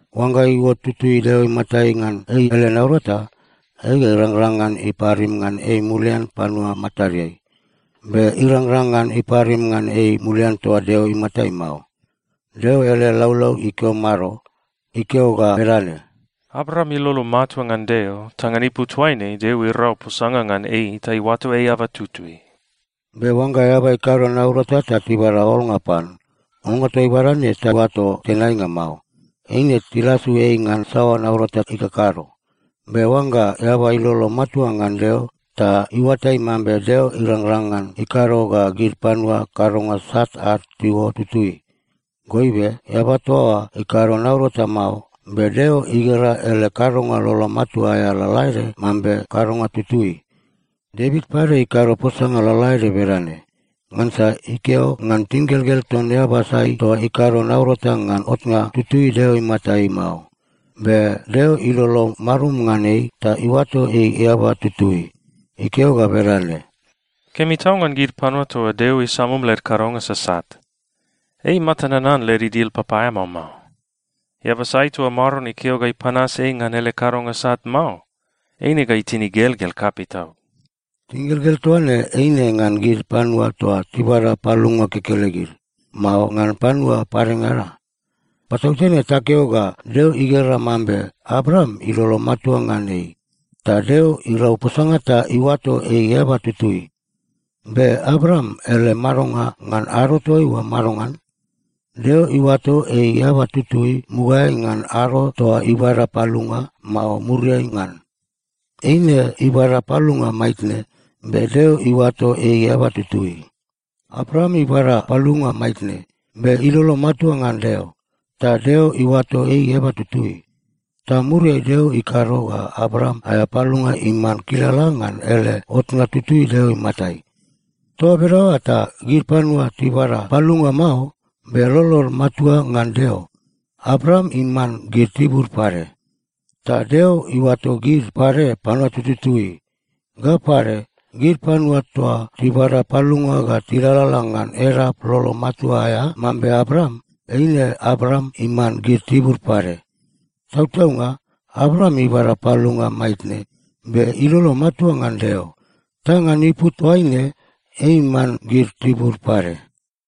Oangga iuot tutui Deo imatai ngan ei ele naurata, ei ga irangrang ngan iparim ngan ei mulian panua matadeai. Be irangrang ngan iparim ngan ei mulian toa Deo imatai mao. Deo ele laulau ikeo mado? Ikeo ga bedane, “Abraam ilolo matua ngan Deo, ta ngan ipu toaine Deo irau posanga ngan ei ta iuato ei eaba tutui.” Be oangga eaba ikado naurata ta tibada olnga pan, olnga toa ibada ne taoato tenainga mao. Eine tilasu ei ngan saoa naurata ikakado. Be oangga eaba ilolo matua ngan Deo ta iuatai mambe Deo irangrang ngan ikado ga gid panua kadonga sat ad tiuot tutui, goibe eaba toa oa ikado naurata mao, be Deo igera ele kadonga lolo matua aea lalaede mambe kadonga tutui. Devit pade ikado posanga lalaede bedane. Ngansa ikeo ngan tingelgel ton eaba sai toa ikado naurata ngan otnga tutui Deo imatai mao, be Deo ilolo marum ngan ei ta iuato ei eaba tutui. Ikeo ga bedane, “Kemi tau ngan gid panua toa Deo isamum led kadonga sasat! Ei imata nanan led idil papaeamao mao. Eaba sai toa Maron ikeo ga ipanas ei ngan ele kadonga sat mao, eine ga itin igelgel kapei tau.” Tingelgel toa ne eine ngan gid panua toa tibada palunga kekelegid, mao ngan panua padengada? Patautene takeo ga Deo igera mambe Abraam ilolo matua ngan ei, ta Deo irau posanga ta iuato ei eaba tutui. Be Abraam ele madonga ngan ado toaiua madongan? Deo iuato ei eaba tutui mugaeai ngan ado toa ibada palunga, mao muriai ngan? Eine ibada palunga maitne, be Deo iuato ei eaba tutui. Abraam ibada palunga maitne, be ilolo matua ngan Deo, ta Deo iuato ei eaba tutui. Ta muriai Deo ikado ga Abraam aea palunga iman kilala ngan ele otnga tutui Deo imatai. Toa bedaoa ta gid panua tibada palunga mao, be lolod matua ngan Deo, Abraam iman gid tibud pade. Ta Deo iuato gid pade panua tututui. Ga pade, gid panua toa tibada palunga ga tilalala ngan edap lolo matua aea mambe Abraam, eine Abraam iman gid tibud pade. Tautaunga Abraam ibada palunga maitne be ilolo matua ngan Deo. Ta ngan ipu toaine ei iman gid tibud pade.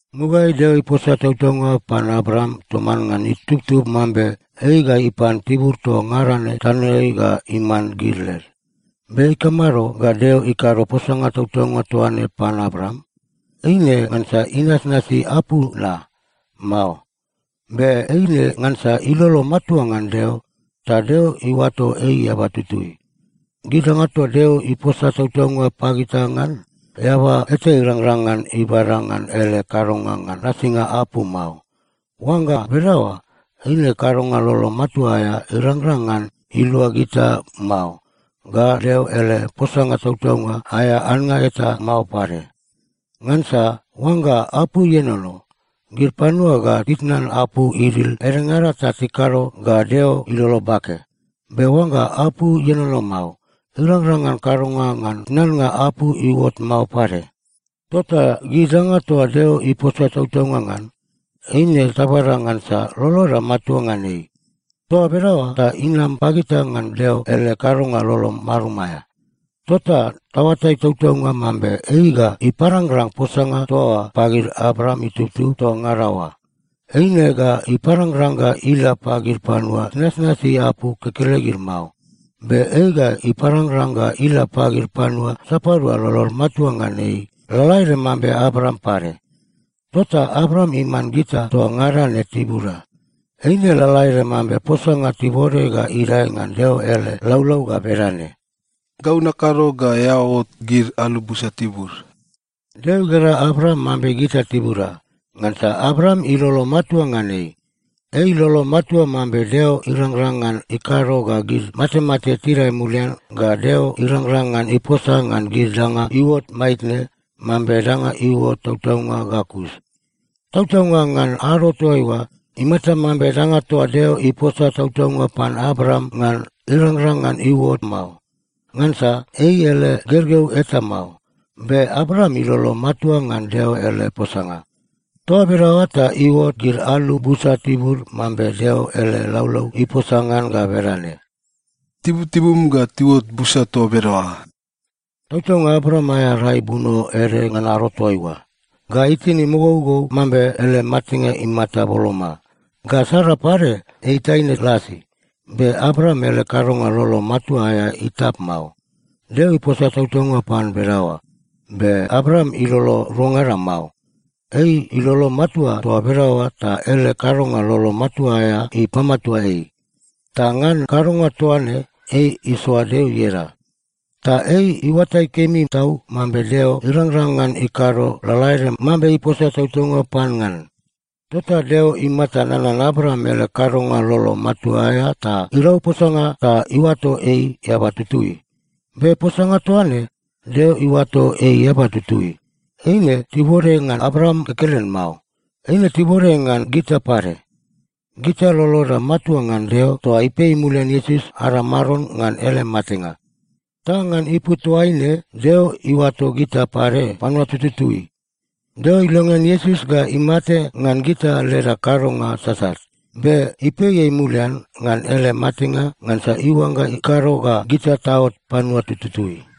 Mugaeai Deo iposa tautaunga pan Abraam toman ngan itubtub mambe ei ga ipan tibur toa ngada ne tanoeai ga iman gid led. Be ikamado ga Deo ikado posanga tautaunga toa ne pan Abraam? Eine ngansa inasnasi apu na? Mao. Be eine ngansa ilolo matua ngan Deo, ta Deo iuato ei eaba tutui. Gid danga toa Deo iposa tautaunga pagita ngan, eaba eta irangrang ngan ibada ngan ele kadonga ngan nasinga apu mao. Oangga bedaoa, eine kadonga lolo matua aea irangrang ngan ilua gita mao, ga Deo ele posanga tautaunga aea annga eta mao pade. Ngansa oangga apu ienono, gid panua ga titnan apu idil edengada ta tikado ga Deo ilolo bake. Be oangga apu ienono mao, irangrang ngan kadonga ngan tnannga apu iuot mao pade. Tota gid danga toa Deo iposa tautaunga ngan, eine tabada ngansa loloda matua ngan ei. Toa bedaoa ta inam pagita ngan Deo ele kadonga lolo marum aea. Tota taoatai tautaunga mambe ei ga iparangrang posanga toa oa pagid Abraam itubtub toa ngada oa. Eine ga iparangrang ga ila pagid panua tinasnasi apu kekelegid mao. Be ei ga iparangrang ga ila pagid panua sapadua lolod matua ngan ei lalaede mambe Abraam pade. Tota Abraam iman gita toa ngada ne tibuda. Eine lalaede mambe posanga tibode ga idae ngan Deo ele laulau ga bedane, “Gau nakado ga eao ot gid alu busa tibud.” Deo igera Abraam mambe gita tibuda, ngansa Abraam ilolo matua ngan ei. Ei ilolo matua mambe Deo irangrang ngan ikado ga gid matemate tidae mulian ga Deo irangrang ngan iposa ngan gid danga iuot maitne mambe danga iuot tautaunga ga kus. Tautaunga, ngan ado toaiua, imata mambe danga toa Deo iposa tautaunga pan Abraam ngan irangrang ngan iuot mao, ngansa ei ele gergeu eta mao. Be Abraam ilolo matua ngan Deo ele posanga. Toa bedaoa ta iuot gid alu busa tibud mambe Deo ele laulau iposa ngan ga bedane, “Tibutibum ga tiuot busa toa bedaoa.” Tautaunga Abraam aea rai buno ede ngan ado toaiua, ga itin imogougou mambe ele matenga imata boloma, ga Sara pade ei taine lasi, be Abraam ele kadonga lolo matua aea itap mao. Deo iposa tautaunga pan bedaoa, be Abraam ilolo ruangada mao. Ei ilolo matua toa bedaoa ta ele kadonga lolo matua aea ipamatua ei. Ta ngan kadonga toa ne ei isoa Deo ieda. Ta ei iuatai kemi tau mambe Deo irangrang ngan ikado lalaede mambe iposa tautaunga pan ngan. Tota Deo imata nanan Abraam ele kadonga lolo matua aea ta “irau posanga ta iuato ei eaba tutui.” Be posanga toa ne, “Deo iuato ei eaba tutui,” eine tibode ngan Abraam kekelen mao. Eine tibode ngan gita pade. Gita loloda matua ngan Deo toa ipei mulian Iesus ada Maron ngan ele matenga. Ta ngan ipu toaine Deo iuato gita pade panua tututui. Deo ilongean Iesus ga imate ngan gita leda kadonga sasat, be ipei ei mulian ngan ele matenga ngansa iuangga ikado ga gita taot panua tututui.